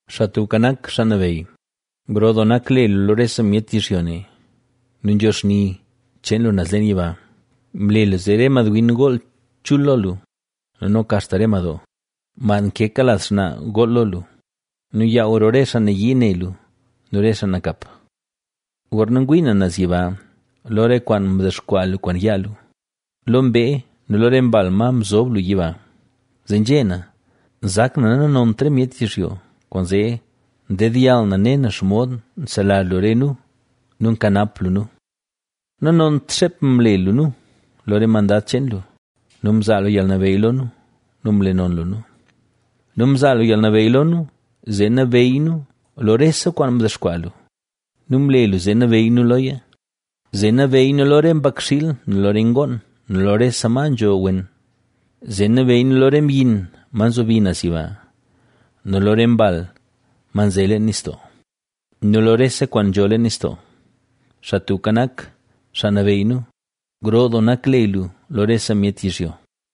¡Xaa Tubka Nak, xaa nabeyy, gro doo nak le lu lo rese myet yizhyo ne! ¡Nu nzho xni cheen lu naz leen yiba! Mle lu zee re madwin gool chul lo lu nu noka axta re madoo, mad nkeka laz xnaa, gool lo lu nu yaaw roo re xaa nayii ne lu nu re xaa nakap. Gorna ngwii na naz yiba, lo re kwaan mdexkwaa lu kwaan yaa lu, lo mbee nu lo re mbal, ma mzob lu yiba, zee nzhé na: nzak na nanont re myet yizhyo, kwaanzee ndedyall na ne na xomod nselazh lu re nu nu nkanap lu nu. Nanont xeep mle lu nu, lo re mandad cheen lu nu mzaa lu yalnabeyy lo nu nu mle non lu nu. Nu mzaa lu yalnabeyy lo nu, zee nabeyy nu lo rese kwaan mdexkwaa lu nu mle lu zee nabeyy nu loya; zee nabeyy nu lo re mbakxiil nu lo re ngoon nu lo rese ma nzho wen, zee nabeyy nu lo re myin, ma nzobi naz yiba nu lo re mbal, ma nze leen nistoo ¡nu lo rese kwaan nzho leen nistoo! ¡Xaa Tubka Nak, Xaa Nabeyy nu gro doo nak le lu lo rese myet yizhyo!